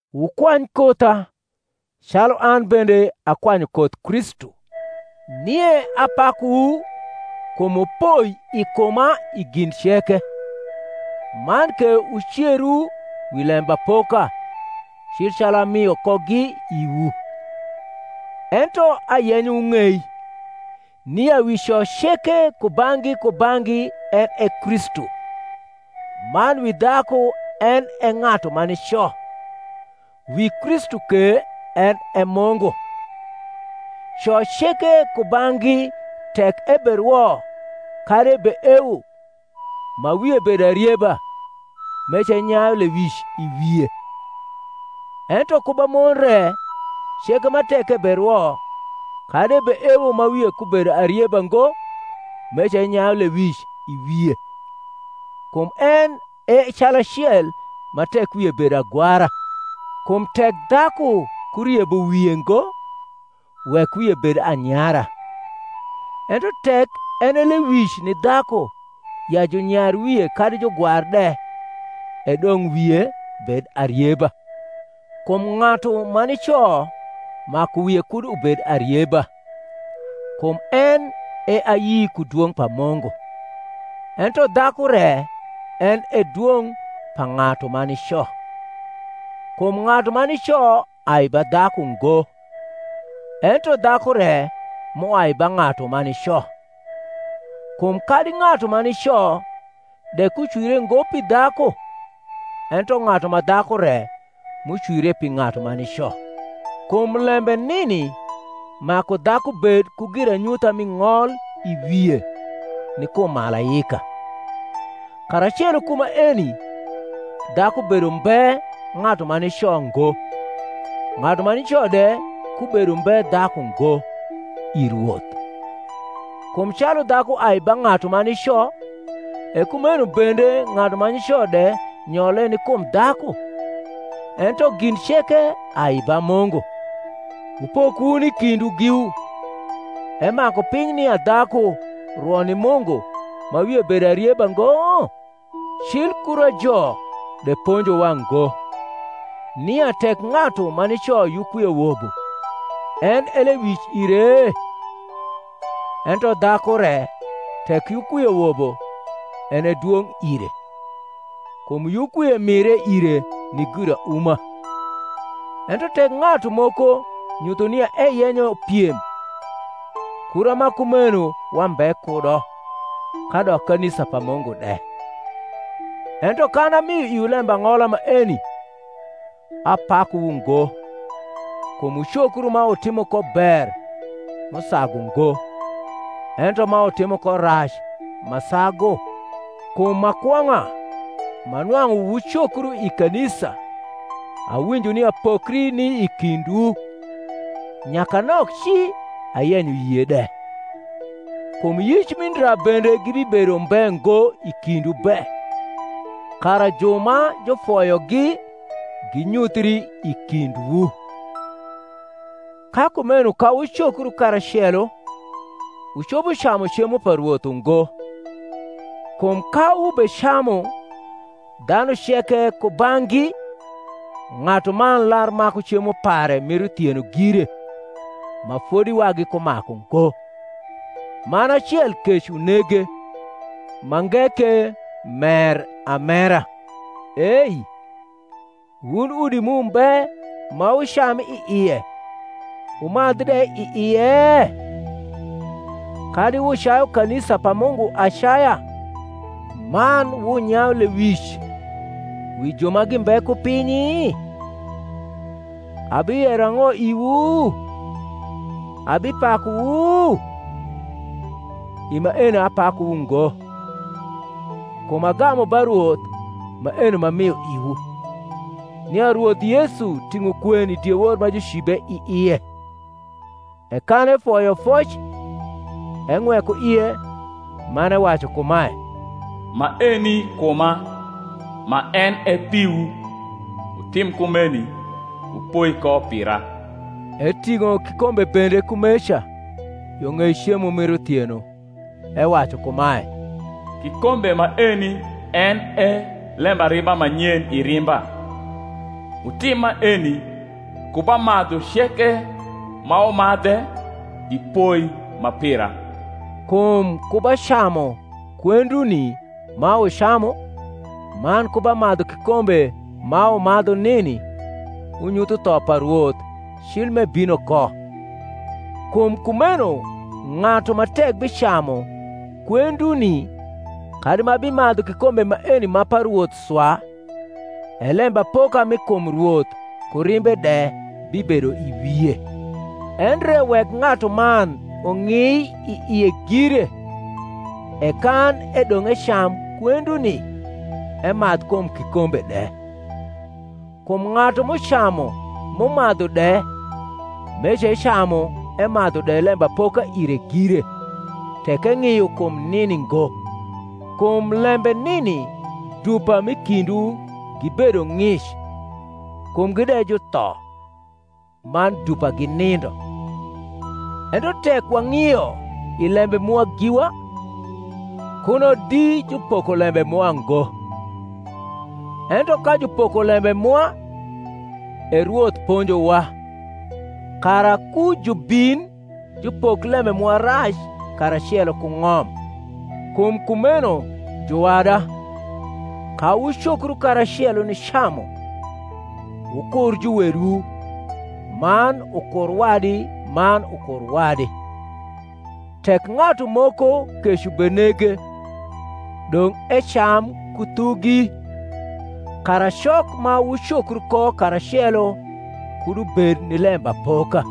Wukwany kotha, calu an bende akwanyu koth Kristu. Nie apakuwu kum wupoi i kuma i gin ceke, man ke wuceru wi lembapoka, cil calu amio kogi iwu. Ento ayenyo wung’ei, nia wi co ceke kubang’gi kubang’gi en e Kristu; man wi dhaku en e ng’atu ma nico; wi Kristu ke en e Mungu. Co ceke kubang’gi tek eberwo kadi ebeewo, ma wie bedo arieba, meca enyayu lewic i wie. Ento ku ba mon re ceke ma tek eberwo kadi ebeewo ma wie kubedo arieba ngo meca enyayu lewic i wie; kum en e calacel ma tek wie bedo agwara. Kum tek dhaku kuriebo wie ngo, wek wie bed anyara: ento tek en e lewic ni dhaku ya junyar wie kadi jugwar de, e dong’ wie bed arieba. Kum ng’atu ma nico maku wie kud ubed arieba, kum en e ayi ku dwong’ pa Mungu: ento dhaku re en e dwong’ pa ng’atu ma nico. Kum ng’atu ma nico ai ba dhaku ngo; ento dhaku re m’uai ba ng’atu ma nico: kum kadi ng’atu ma nico de kucwire ngo pi dhaku; ento ng’atu ma dhaku re m’ucwire pi ng’atu ma nico: kum lembe nini maku dhaku bed ku giranyutha mi ng’ol i wie, ni kum malaika. Karacelo ku maeni, dhaku bedo umbe ng’atu ma nico ngo, ng’atu ma nico de kubedo umbe dhaku ngo, i Rwoth. Kum calu dhaku ai ba ng’atu ma nico, e kumcno bende ng’atu ma nico de nyole ni kum dhaku; ento gin ceke ai ba Mungu. Wupok wun i kindwu giwu: emaku piny nia dhaku rwo ni Mungu ma wie bedo arieba ngo? Cil kurajo de ponjowa ngo, nia, tek ng’atu ma nico yukwie wobo, en e lewic ire? Ento dhaku re tek yukwie wobo, en e dwong’ ire: kum yukwie mire ire ni girauma. Ento tek ng’atu moko nyutho nia eyenyo piem, kura ma kumeno wambe kudo, kadok kanisa pa Mungu de. Ento kan amio iwu lembang’ola maeni, apakuwu ngo, kum wucokru ma wutimo ko ber m’usagu ngo, ento ma wutimo ko rac ma sagu. Kum ma kwong’a, ma nwang’u wucokru i kanisa, awinjo nia pokri ni i kindwu; nyakanok ci ayenyo yie de. Kum yic mi ndra bende gibibedo umbe ngo i kindwu be, kara ju ma jufoyogi ginyuthri i kindwu. Ka kumeno ka wucokru karacelo, wucopo camu cemo pa Rwoth ungo: kum ka wubecamu dhanu ceke kubang’gi ng’atuman lar maku cemo pare mir uthieno gire ma fodi wagi kumaku ngo; man acel kec unege, mange ke mer amera. Ei, wun udi mu mbe ma wucam i ie wumadh de i ie? kadi wucayu kanisa pa Mungu acaya, man wunyayu lewic wi ju ma gimbe ku pinyi? Abiyero ang’o iwu? abipakuwu? I maeni apakuwu ngo. Kum agamu ba Rwoth maeno m’amio iwu, nia Rwoth Yesu ting’o kwen i diewor ma jucibe i ie; e kan efoyo foc, eng’weko ie, man ewacu kumae, Maeni kuma, ma en e piwu; wutim kumeni wupoi ko pira. Eting’o kikombe bende kumeca, yo ng’ei cemo mir uthieno, ewacu kumae, Kikombe maeni en e lembariba ma nyen i rimba: wutim maeni, ku ba madhu ceke ma wumadhe, i poi ma pira. Kum ku ba camu kwenduni ma wucamu, man ku ba madhu kikombe ma wumadhu nini, wunyutho tho pa Rwoth cil m’ebino ko. Kum kumeno ng’atu ma tek bicamu kwenduni kadi ma bimadhu kikombe maeni ma pa Rwoth swa, e lembapoka mi kum Rwoth ku rimbe de bibedo i wie. Endre wek ng’atuman ung’i i ie gire, e kan edong’ ecam kwenduni, emadh kum kikombe de. Kum ng’atu m’ucamu m’umadhu de, meca ecamu emadhu de lembapoka ire gire, tek eng’io kum nini ngo. Kum lembe nini dupa m’i kindwu gibedo ng’ic kumgi de jutho, man dupa ginindo. Ento tek wang’io i lembe mwa giwa, kuno di jupoko lembe mwa ngo. Ento ka jupoko lembe mwa, e Rwoth ponjowa, kara ku jubin jupok lembe mwa rac karacelo ku ng’om. Kum kumeno, juwada, ka wucokru karacelo nicamu. wukur juwedwu man ukur wadi man ukur wadi. Tek ng’atu moko kec ubenege, dong’ ecam ku thugi; kara cok ma wucokru ko karacelo kud ubed ni lembapoka.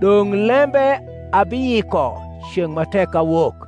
Dong lembe abiyiko ceng’ ma tek awok.